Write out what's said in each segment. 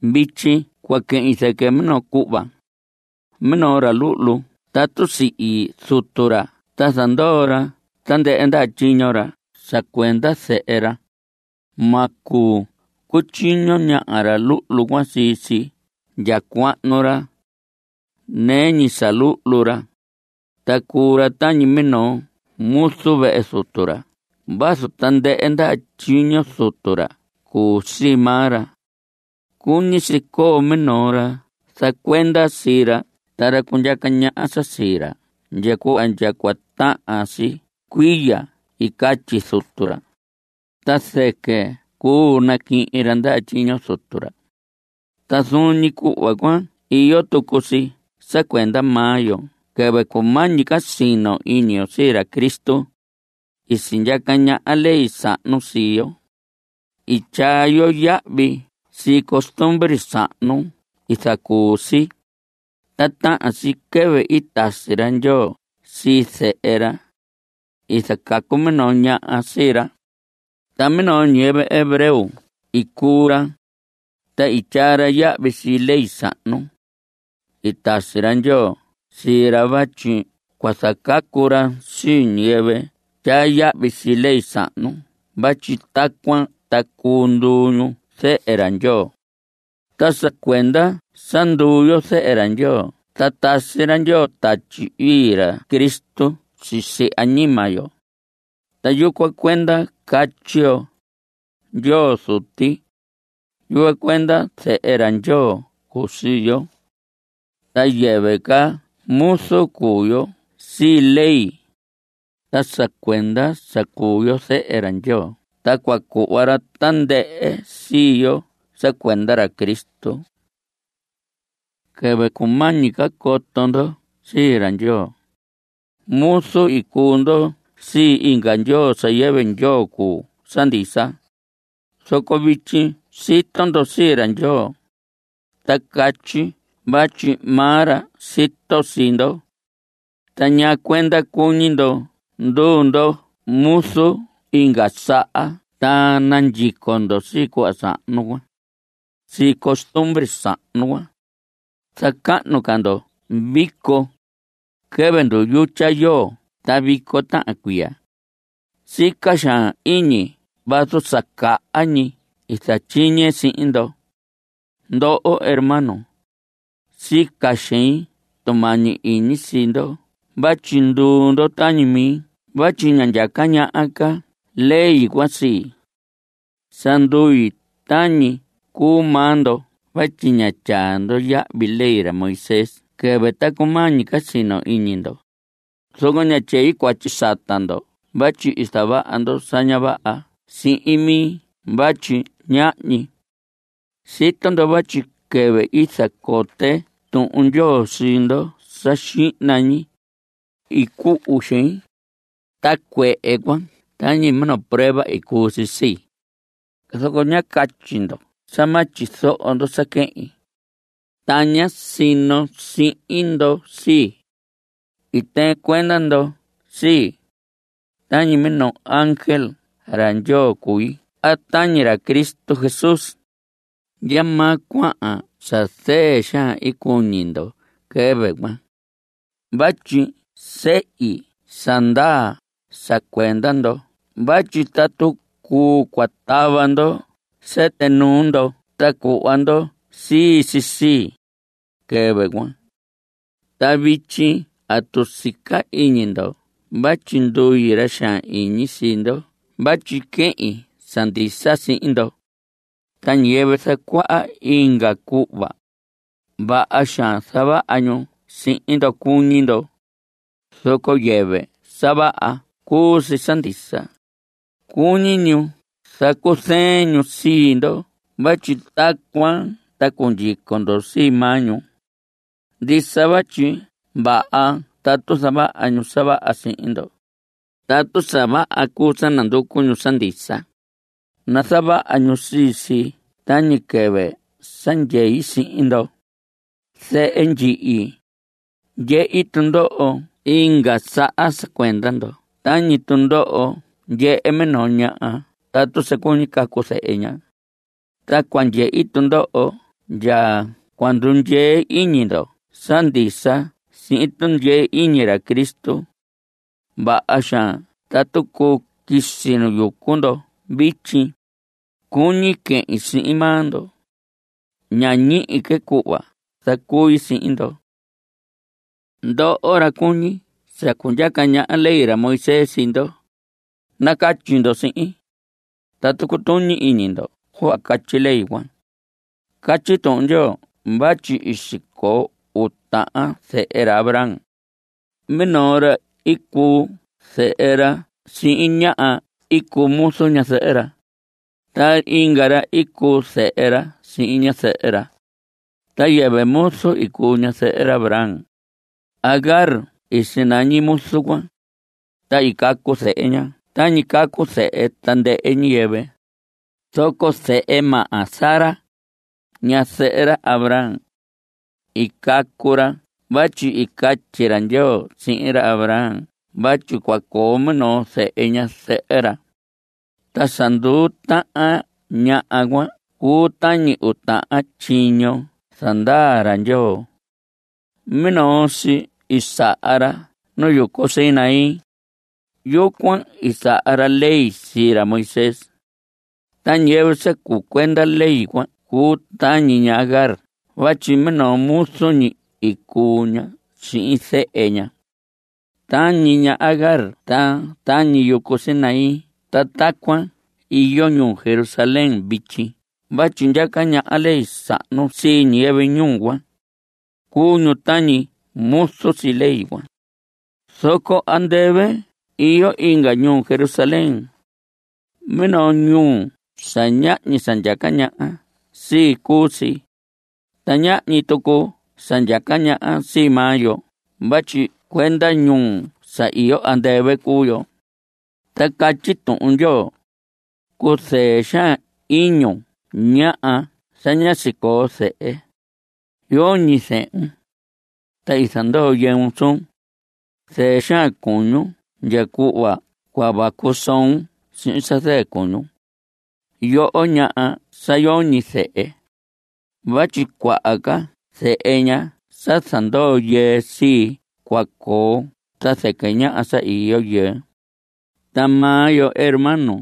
Vityi cua quehin zɨquɨ minoo cuhva. Minoo ra luhlu tatu sihi zutu ra ta zandoo ra tandɨhɨ ndaha tyiño ra sa cuenda zehe ra, ma cuu cutyiño ñaha ra luhlu cuan sii si ndya cuahnu ra. Nɨɨ ñi sa luhlu ra, ta cuu ra tañi minoo muzu vehe zutu ra vazu tandɨhɨ ndaha tyiño zutu ra cuu sii maa ra. Cuñi si coo minoo ra zacuenda sii ra ta ra cundyaca ñaha sa sii ra ndya cuhva ndya cua tahan si cuiya i catyi zutu ra, ta zɨquɨ cuu naquihin ra ndaha tyiño zutu ra. Ta zuun ñi cuhva cuan iyo tucu si sa cuenda maa yo. Quɨvɨ cumañi ca sino iñi yo sii ra Cristo, i sindyaca ñaha ley sahnu sii yo; i tyaa yo yahvi sii costumbre sahnu i zacuu si. Ta tahan si quɨvɨ i tasi ra Ndyoo sii Zehe ra. I zacacu minoo ñaha sii ra, ta minoo ñiyɨvɨ hebreo i cuu ra, ta i tyaa ra yahvi sii ley sahnu. I tasi ra Ndyoo sii ra vatyi cua zacacu ra sii ñiyɨvɨ tyaa yahvi sii ley sahnu vatyi tacuan ta cuu nduu ñu zehe ra Ndyoo. Ta sa cuenda sa nduu yo zehe ra Ndyoo ta tasi ra Ndyoo Tatyi Ii ra Cristo sisi añima yo. Ta yucuan cuenda catyi yo: “Ndyoo Zuti.” Yucuan cuenda zehe ra Ndyoo cuu sii yo, ta yɨvɨ ca muzu cuu yo sii ley. Ta sa cuenda sa cuu yo zehe ra Ndyoo ta cua cuhva ra tandɨhɨ sii yo sa cuenda ra Cristo. Quɨvɨ cumañi ca coto ndo sii ra Ndyoo, muzu i cuu ndo sii inga ndyoo sa yɨvɨ ndyoo cuu sa ndisa. Zoco vityi sito ndo sii ra Ndyoo, a catyi vatyi maa ra sito sii ndo. ¿Ta ñaa cuenda cuñi ndo nduu ndo muzu inga saha ta nandyico ndo sii cuhva sahnu cuan (sii costumbre sahnu cuan)? Zacahnu ca ndo vico, quɨvɨ nduyutya yoo ta vico tahan cuiya. Sica xaan iñi vazu sa caha ñi i zatyiñe sihin ndo. Ndoho hermanos, sica xein tumañi iñi sii ndo vatyi nduu ndo tañi mi vatyi ña ndyaca ñaha ca ley cuan sii. Sa ndui tañi i cuu maa ndo vatyi ñá tyaa ndo yahvi ley ra Moisés quɨvɨ ta cumañi ca sino iñi ndo. Zoco ña tyei cuatyi sata ndo vatyi i zavaha ndo sa ña vaha sihin mi vatyi ñahñi. Sito ndo vatyi quɨvɨ i zacote Tuhun Ndyoo sii ndo sa xihna ñi, i cuhu xein. Ta cuehe cuan tañi minoo prueba i cuu si sii, zoco ñá catyi ndo sa ma tyizoho ndo sa quehin, ta ñá sino sihin ndo sii. I tɨɨn cuenda ndo sii, tañi minoo ángel ra Ndyoo cui a tañi ra Cristo Jesús. ¿Ndyamaa cuahan sa zɨɨ xaan cuñi ndo quɨvɨ cuan? vatyi sehi sa ndaa sa cuenda ndo vatyi tatu cuu, cua tava ndo sɨtɨ nuu ndo ta cuhva ndo sii si sii, quɨvɨ cuan. Ta vityi ¿atu sica iñi ndo vatyi ndui ra xaan iñi sii ndo vatyi quehin sa ndisa sihin ndo? Ta ñiyɨvɨ zacuaha inga cuhva cuan, vaha xaan zavaha ñu sihin ndo cuñi ndo, zoco yɨvɨ sa vaha cuu si sa ndisa. Cuñi ñu zacuzɨɨn ñu sii ndo vatyi tacuan ta cua cundyico ndo sii maa ñu. Ndisa vatyi vaha tatu zavaha ñu sa vaha sihin ndo. Tatu sa vaha cuu sa nanducu ñu sa ndisa, nazavaha ñu sii si tañi quɨvɨ sa ndyei sihin ndo. Zehe ndyihi, ndyehi tundoho inga saha sa cuenda ndo tañi tundoho ndyehe minoo ñaha tatu sa cuñi cacu zehe ña. Ta cua ndyehi tundoho ndya cua ndundyee iñi ndo sa ndisa sihin tundyee iñi ra Cristo. Vaha xaan tatu cuu quisi nu yucu ndo vityi; cuñi quehin sihin maa ndo. Ña ñihi que cuhva zacui sihin ndo. Ndoho, ra cuñi sa cundyaca ñaha ley ra Moisés sii ndo, nacatyi ndo sihin: ¿Atu cutuñi iñi ndo cuhva catyi ley cuan? Catyi Tuhun Ndyoo vatyi i sicoo uu tahan zehe ra Abraham. Minoo ra i cuu zehe ra sihin ñaha i cuu muzu ñazɨhɨ ra. Ta inga ra i cuu zehe ra sihin ñazɨhɨ ra. Ta yɨvɨ muzu i cuu ñazɨhɨ ra Abraham. Agar i sinañi muzu cuan, ta i cacu zehe ña tañi cacu zehe tandɨhɨ ñiyɨvɨ. Zoco zehe maha Sara, ñazɨhɨ ra Abraham, i cacu ra vatyi i catyi ra Ndyoo sihin ra Abraham vatyi cua coo minoo zehe ñazɨhɨ ra. Ta sa nduu tahan ñaha cuan cuu tañi uu tahan tyiño zandaa ra Ndyoo. Minoo si i saha ra nu yucu Sinaí. Yucuan i saha ra ley sii ra Moisés. Ta ñiyɨvɨ sa cuu cuenda ley cuan cuu tañi ña Agar vatyi minoo muzu ñi i cuu ña sihin zehe ña. Tañi ña Agar ta tañi yucu Sinaí ta tacuan iyo ñuu Jerusalén vityi vatyi ndyaca ñaha ley sahnu sii ñiyɨvɨ ñuu cuan. Cuu ñu tañi muzu sii ley cuan. Zoco andɨvɨ iyo inga ñuu Jerusalén. Minoo ñuu sa ñahñi sa ndyaca ñaha sii cuu si. Ta ñahñi tucu sa ndyaca ñaha sii maa yo vatyi cuenda ñuu sa iyo andɨvɨ cuu yo. Ta catyi Tuhun Ndyoo: Cuzɨɨ xaan iñun ñaha sa ñá sicoo zehe; yoñi zehun, ta i zandoo yɨun suun. Zɨɨ xaan cuñun ndya cuhva cua vacu soon sihin sa zɨɨ cuñun, yoho ñaha sa yoñi zehe. Vatyi cuaha ca zehe ñaha sa zandoo yɨɨ sii cua coo ta zɨquɨ ñaha sa iyo yɨɨ. Ta maa yo hermanos,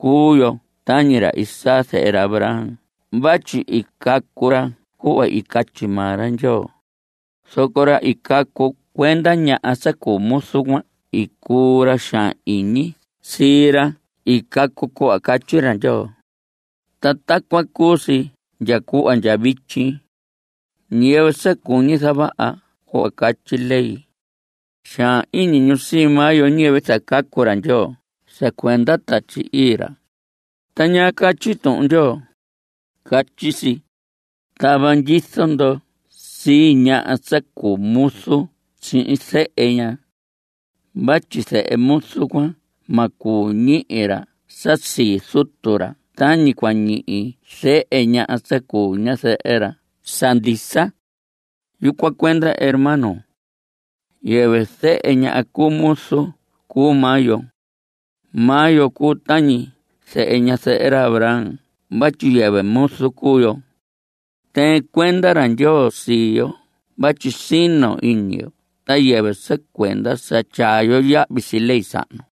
cuu yo tañi ra Isaac zehe ra Abraham vatyi i cacu ra cuhva i catyi maa ra Ndyoo. Zoco ra i cacu cuenda ñaha sa cuu muzu cuan i cuu ra ra xaan iñi sii ra i cacu cuhva catyi ra Ndyoo, ta tacuan cuu si ndya cuhva ndya vityi. Ñiyɨvɨ sa cuñi zavaha cuhva catyi ley, xaan iñi ñu sii maa yo ñiyɨvɨ zacacu ra Ndyoo sa cuenda Tatyi Ii ra. Ta ¿ñaa catyi Tuhun Ndyoo? Catyi si: “Tava ndyizo ndo sii ñaha sa cuu muzu sihin zehe ña. Vatyi zehe muzu cuan ma cuu ñihi ra sa sii zutu ra tañi cua ñihi zehe ñaha sa cuu ñazɨhɨ ra sa ndisa.” Yucuan cuenda, hermanos, yɨvɨ zehe ñaha cu muzu cuu maa yo. Maa yo cuu tañi zehe ñazɨhɨ ra Abraham vatyi yɨvɨ muzu cuu yo. (Tɨɨn cuenda ra Ndyoo sii yo vatyi sino iñi yo ta yɨvɨ sa cuenda sa tyaa yo yahvi sii ley sahnu.)